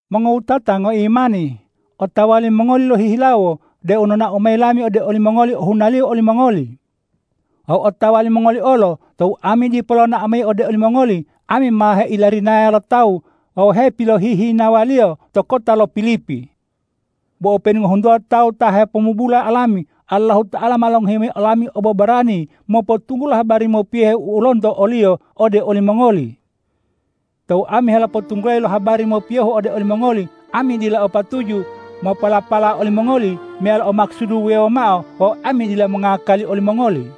Mongowutata ngoimani, otawa limongoli lohihilawo deu nonao mayi lami ode olimongoli ohunaliyo olimongoli. Wawu otawa limongoli olo tou ami dipo lonao mayi ode olimongoli, ami ma heilarinaya lo tawu wawu hepilohihinawaliyo to kota lo Pilipi. Bo openu ngohuntuwa tawu ta hepomubula olami, Allahuta'ala ma longohi mayi olami obobarani mopotunggulo habari mopiyohe u lonto o-Liyo ode olimongoli. Tou ami helopotunggulayi lo habari mopiyohu ode olimongoli, ami dila o patuju mopolapala olimongoli meyalo o makusudu wuwewo mao wawu ami dila mongakali olimongoli.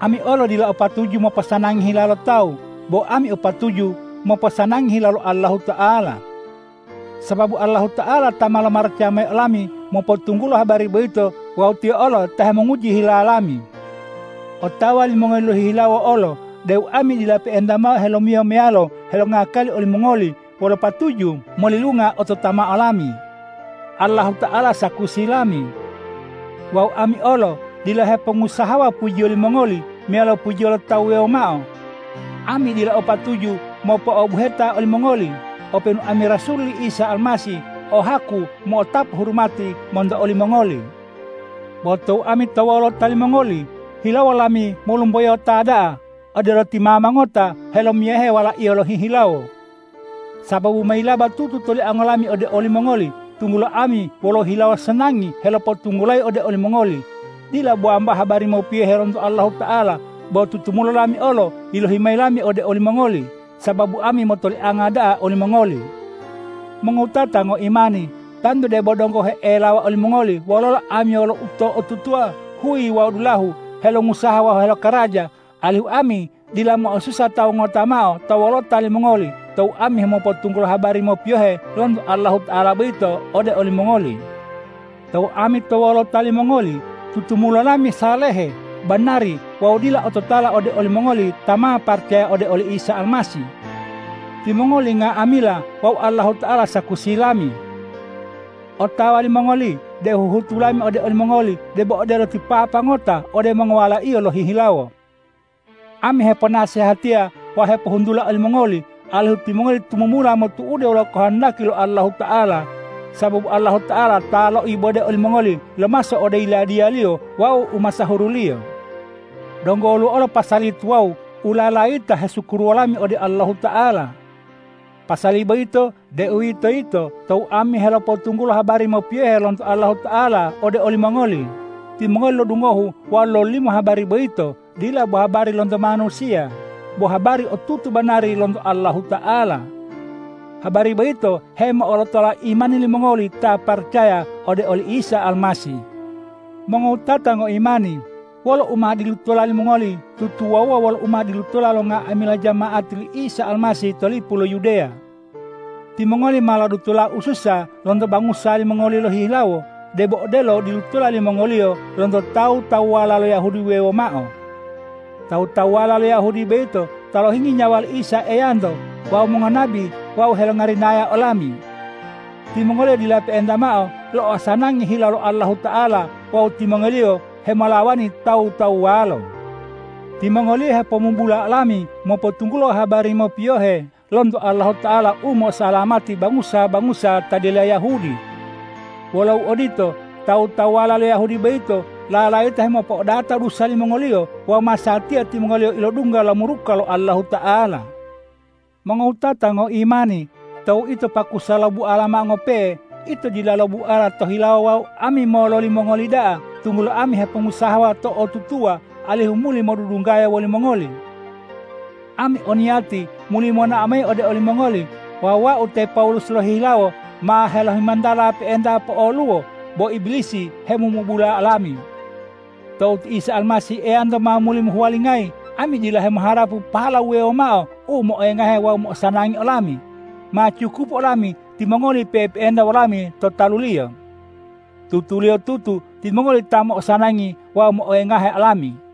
Ami olo dila o patuju moposanangi hila lo tawu, bo ami o patuju moposanangi hila lo Allahuta'ala. Sababu Allahuta'ala ta ma lomaracaya mayi olami mopotunggulo habari boyito wawu Tiyo olo ta hemonguji hila lami. Otawa limongoli lohihilawo olo deu ami dila pe'enta mao helomiyo meyalo helongakali olimongoli wolo patuju molilunga ototamao lami. Allahuta'ala sakusi lami. Wawu ami olo dila hepongusahawa pujiyo limongoli meyalo pujiyo lo tawu wuwewo mao. Ami dila o patuju mopo'obuheta olimongoli, openu ami rasul li Isa Almasih o haku mo'otapu hurumati monto olimongoli. Bo tou ami to wolota limongoli, hilawo lami molumboyota da'a, odelo ti mama ngota helomiyahe walaiyo lohihilawo. Sababu ma yilaba tutu toliango lami ode olimongoli, tunggulo ami wolo hilawo sanangi helopotunggulayi ode olimongoli, dila bo wambao habari mopiyohe lonto Allahuta'ala, bo tutumulo lami olo yilohi mayi lami ode olimongoli, sababu ami motolianga da'a olimongoli. Mongowutata ngoimani, tantu debo donggo he'elawa olimongoli wololo ami wolo uto'otutuwa huyi wawu dulahu helongusaha wawu helokaraja, alihu ami dila mo'osusa tawu ngota mao to wolota limongoli tou ami hemopotunggulo habari mopiyohe lonto Allahuta'ala boyito ode olimongoli. Tou ami to wolota limongoli, tutumulo lami salehe, banari wawu dila ototala ode olimongoli ta ma paracaya ode oli Isa Almasih. Timongoli nga'amila wawu Allahuta'ala sakusi lami. Otawa limongoli deu huhutu lami ode olimongoli debo odelo ti papa ngota ode mongowalaiyo lohihilawo. Ami heponasehatiya wawu hepohuntula olimongoli alihu timongoli tumumula motu'ude wolo kohondaki lo Allahuta'ala, sababu Allahuta'ala ta loibode olimongoli lomaso ode Yiladiya-Liyo wawu umasahuru-Liyo. Donggo woluwo olo pasali tuwawu u lalayita hesukuruwo lami ode Allahuta'ala. Pasali boyito, deuwitoyito tou ami helopotunggulo habari mopiyohe lonto Allahuta'ala ode olimongoli, timongoli lodungohu wawu lololimo habari boyito, dila bo habari lonto manusiya, bo habari u otutu banari lonto Allahuta'ala. Habari boyito hemo'olotola imani limongoli ta paracaya ode oli Isa Almasih. Mongowutata ngoimani, wolo u ma dilutola limongoli tutuwawuwa wolo u ma dilutola lo nga'amila jama'ati li Isa Almasih to lipu lo Yudeya. Timongoli ma lodutola ususa lonto bangusa limongoli lohihilawo, debo odelo u dilutola limongoliyo lonto tawu-tawuwala lo Yahudi wuwewo mao. Tawu-tawuwala lo Yahudi boyito ta lohinggi nyawa li Isa Eyanto wawu mongonabi wawu helongarinaya olami. Timongoliyo dila pe'enta mao lo'osanangi hila lo Allahuta'ala wawu timongoliyo hemolawani tawu-tawuwalo. Timongoliyo hepomubula olami mopotunggulo habari mopiyohe lonto Allahuta'ala u mo'osalamati bangusa-bangusa ta dila Yahudi. Wolo uodito, tawu-tawuwala lo Yahudi boyito lalayita hemopo'odata dusa limongoliyo wawu masatiya timongoliyo ilodungga lo muruka lo Allahuta'ala! Mongowutata ngoimani, tou ito pakusa lobuala mao ngope'e, ito dila lobuala to hilawo wawu ami mololi mongoli da'a, tunggulo ami hepongusahawa to'otutuwa alihu muli modudunggaya wolimongoli! Ami o niyati muli monao mayi ode olimongoli wawu wau te Pawulus lohihilawo ma helohimontala pe'enta po'oluwo, bo Ibilisi hemomubula olami. Tou ti Isa Almasih Eyanto ma muli mohuwalingayi, ami dila hemoharapu pahala wuwewo mao u moengahu wawu mo'osanangi olami: Ma cukupu olami timongoli pe'epe'enta wolami to talu-Liyo. Tutuliyotutu timongoli ta mo'osanangi wawu moengahe olami.